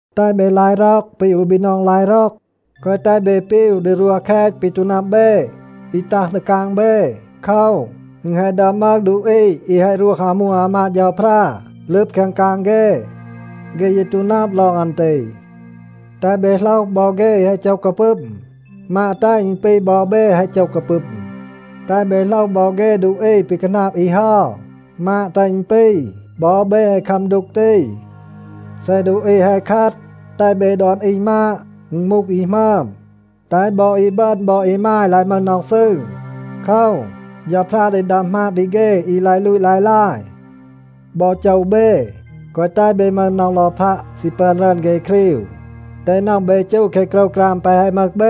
แตห เบ ลาย ร็อก ปี อู บีนอง ลาย ร็อก. แกวะ แตห เบ ปีว ดี รวห แคต ปี ตู นับ เบ, อี ตัห ดี กาง เบ. โคว, อึณ แฮะ ดึอม มึห ดูอี อี แฮะ รวห อามู อามาด เฌาพรา ลึบ แคง กาง เฆ. เฆ ยี ตู นับ ลอง อัน ตี. แตห เบ โหลห บอ เฆ อี แฮะ โจห กาปึม. มาด แตห อึณ ปี บอ เบ แฮะ โจห กาปึม. แตห เบ โหลห บอ เฆ ดูอี ปี คาหนาบ อี เฮา, มาด แตห อึณ ปี, บอ เบ แฮะ คัม ดูก ตี. เซ ดูอี แฮะ คัด, แตห เบ ดอน อี มาด, อึณ มูห อี หมึอม. แตห บอ อีบึณ บอ อีมาย ลาย มึห น็อห ซืร. โคว, เฌาพรา ดี ดัม หมาบ ดี เฆ อี ลาย ลูต ลาย ลาย. บอ โจว เบ, แกวะ แตห เบ มึห น็อห ลอพัะ ซี ปึอน รึอน เฆ ครีว. แตห น็อห เบ จู แคะ โกรวกราม แปะ แฮะ มึห เบ.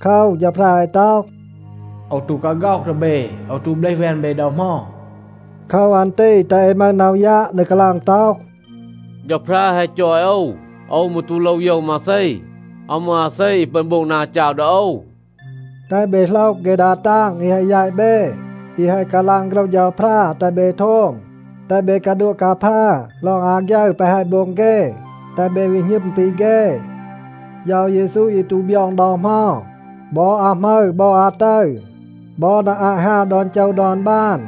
โคว, เฌาพรา แฮะ ต็อห, “โอว ตู กาฆ็อห ดี เบ, โอว ตู เบลห แวน เบ ดอ เหมา.” โคว อัน ตี แตห เอ มึห น็อห ยัะ ดี กาลาง ต็อห, “เฌาพรา แฮะ จอย โอว, โอว มืร ตู โลว โยว มาเซ. อาว มึห อาเซ อี ปึอน โบง นา จาว ดี โอว.” แตห เบ โหลห เฆ ดา ตาง อี แฮะ แยต เบ, อี แฮะ กาลาง โฆรห เฌาพรา แตห เบ โทม. แตห เบ กาดัวะ กาพา ลอง อาฆยึร แปะ แฮะ โบง เฆ, แตห เบ วี หณึม ปี เฆ. เฌา เยซู ยี ตู บยอง ดอ เหมา. บอ อาหมึร บอ อาตึร, บอ นา อาต ฮาว ดอน โจว ดอน บาน,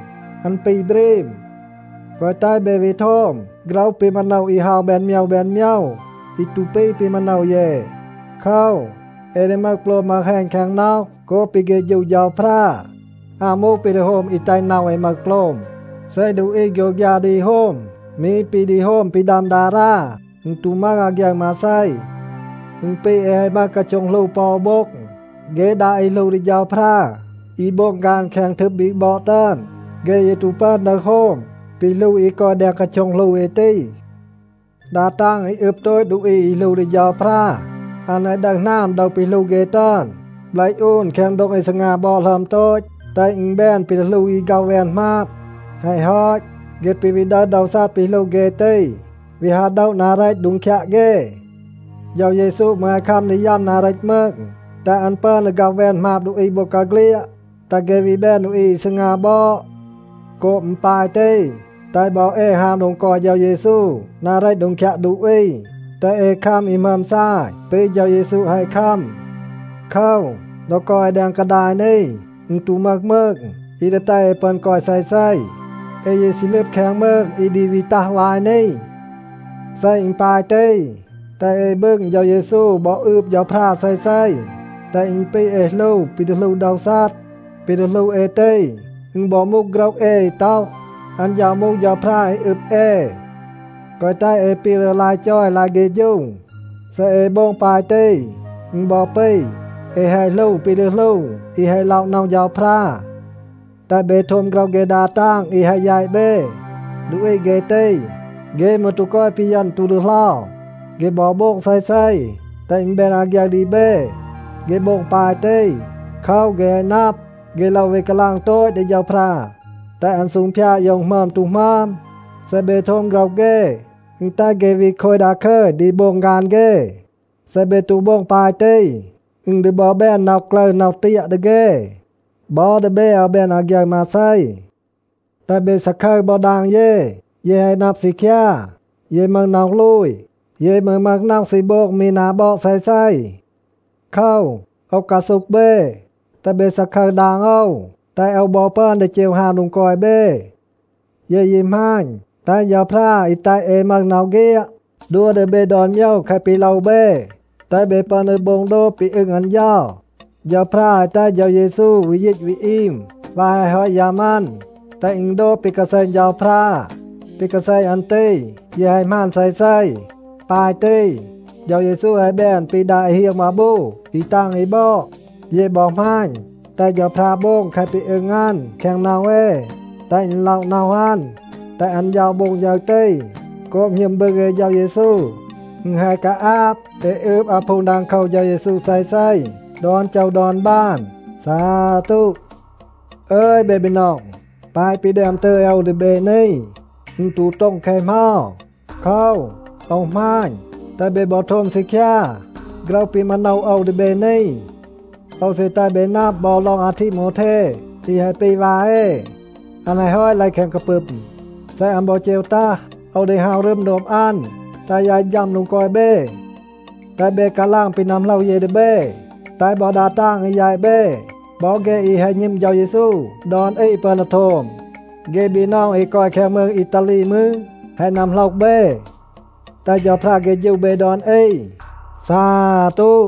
อัน ปี บรีม. แกวะ แตห เบ วี โทม โฆรห ปี มาโนว อี เฮา แบน โมยว แบน โมยว อี ตู ปี ปี มาโนว เย. โคว, เอ ดี มึห โปลม มึห แฮณ แคง น็อห โกบ ปี เฆฌู เฌาพรา. อาว มูห ปี ดี โฮม อี แตห น็อห เอ มึห โปลม. เซ ดูอี โฆยวฆยา ดี โฮม มี ปี ดี โฮม ปี ดัม ดารา, อึณ ตู มึห อาฆยึร มาเซ. อึณ ปี เอ แฮะ มึห กาโช็ง หลู ปอ อู โบ็ง. เฆ ดา อี หลู ดี เฌาพรา อี โบง ฆาน แคง ทึบ บีก บอด ตึอน, เฆ ยี ตู ปึอน ดึห โฮม ปี หลู อี กอย แดง กาโช็ง หลู เอ ตี. ดา ตาง อี อึบ โตต ดูอี อี หลู ดี เฌาพรา, อัน แฮะ ดึห หนาม โดว ปี หลู เฆ ตึอน, เบลห อูน แคง โดง อี ซีงา บอด หลึอม โตต, แตห อึณ แบน ปี ดี หลู อี ฆ็อห แวน หมาบ. แฮะ ฮอต, เฆ ปี วี ดึห โดว ซัด ปี หลู เฆ ตี, วี ฮาว โดะ นา เรต โดง คยัะ เฆ. เฌา เยซู มืร แฮะ คัม ดี ยัม นา เรต มืง, แตห อัน ปึอน ดี ฆ็อห แวน หมาบ ดูอี บอกาเฆลียด, แตห เฆ วี แบน ดูอี อี ซีงา บอด. โกบ อึณ ปาย ตี, แตห บอ เอ ฮาว โดง กอย เฌา เยซู นา เรต โดง คยัะ ดูอี. แตห เอ คัม อี หมึอม ซาย ปี เฌา เยซู แฮะ คัม. โคว, ดอ กอย เอ แดง กาดาย นี, อึณ ตู มึห มืง อี ดี แตห เอ ปึอน กอย เซเซ. เอ ยี ซี ลึบ แคง มืง อี ดี วี ตัห วาย นี. เซ อึณ ปาย ตี, แตห เอ บึง เฌา เยซู บอ อืบ เฌาพรา เซเซ, แตห อึณ ปี เอ หลู ปี ดี หลู โดว ซัด. ปี ดี หลู เอ ตี, อึณ บอ มูห โฆรห เอ อี ต็อห, อัน เฌา มูห เฌาพรา อี อึบ เอ. แกวะ แตห เอ ปีว ดี ลาย จอย ลาย เฆฌู. เซ เอ โบง ปาย ตี, อึณ บอ ปี, เอ แฮะ หลู ปี ดี หลู อี แฮะ ล็อะ น็อห เฌาพรา. แตห เบ โทม โฆรห เฆ ดา ตาง อี แฮะ แยต เบ. ดูอี เฆ ตี, เฆ มืร ตู กอย ปีเยณ, ตู ดีเหลา. เฆ บอ โบง เซเซ, แตห อึณ แบน อาฆยึร ดี เบ. เฆ โบง ปาย ตี โคว, เฆ แฮะ นับ, เฆ โลว วี กาลาง โตต ดี เฌาพรา, แตห อัน ซูงพยาด โยว อึณ หมึอม ตู หมึอม. เซ เบ โทม โฆรห เฆ, อึณ แตห เฆ วี โคย ดาคึย ดี โบง ฆาน เฆ. เซ เบ ตู โบง ปาย ตี, อึณ ดี บอ แบน น็อห กลึร น็อห เตียะ ดี เฆ. บอ ดี เบ อาว แบน อาฆยึร มาเซ. แตห เบ ซาคึร บอ ดาง เย. เย แฮะ นับ ซีคยา, เย มึห น็อห ลูย. เย มืร มึห น็อห ซี โบง มี นา บอด เซเซ. โคว, โอว กาซูห เบ, แตห เบ ซาคึร ดาง โอว, แตห โอว บอ ปึอน ดี เจว ฮาว โดง กอย เบ. เย ยี หมาณ, แตห เฌาพรา อี แตห เอ มึห น็อห เฆียด, ดัว ดี เบ ดอน โมยว แคะ ปี โลว เบ, แตห เบ ปึอน ดี โบง โดบ ปี อึง อัน เฌา. เฌาพรา แฮะ แตห เฌา เยซู วี ยีต วี อีม วาย แฮะ ฮอต ยัม อัน, แตห อึณ โดบ ปี กาแซณ เฌาพรา. ปี กาแซณ อัน ตี ยี แฮะ หมาน เซเซ. ปาย ตี, เฌา เยซู แฮะ แบน ปี ดา อี เฮียง มาบู อี ตาง อี บอด. เย บอ หมาณ, แตห เฌาพรา โบง แคะ ปี อึง อัน แคง น็อห เอ, แตห อึณ ล็อะ น็อห อัน. แตห อัน เฌา โบง ฌึร ตี, โกบ หณึม บึง เอ เฌา เยซู. อึณ แฮะ กาอาบ เอ อืบ อาพูง ดังโคว เฌา เยซู เซเซ ดอน โจว ดอน บาน. ซาตู. อึย เบ บีนอง, แปะ ปี แดม ตึย โอว ดี เบ นี, อึณ ตู โต็ง แคะ เหมา. โคว, โอว หมาณ, แตห เบ บอ โทม ซีคยา โฆรห ปี มาโนว โอว ดี เบ นี. โอว ซี แตห เบ นับ บอ ลอง อาทีโมวเท อี แฮะ ปี วา เอ. อัน แฮะ ฮอต เลห แคง กาปึม. เซ อัน บอ เจว ตัห, โอว ดี ฮาว รึม โดบ อัน, แตห ยาย ฌัม โดง กอย เบ. แตห เบ กาลาง ปี นัมโหลห เย ดี เบ, แตห บอ ดา ตาง อี แยต เบ, บอ เฆ อี แฮะ หณึม เฌา เยซู ดอน อี ปึอน ดี โทม. เฆ บีนอง อี กอย แคง มืง อีตาลี มืร, แฮะ นัมโหลห เบ. แตห เฌาพรา เฆฌู เบ ดอน อี. ซาตู.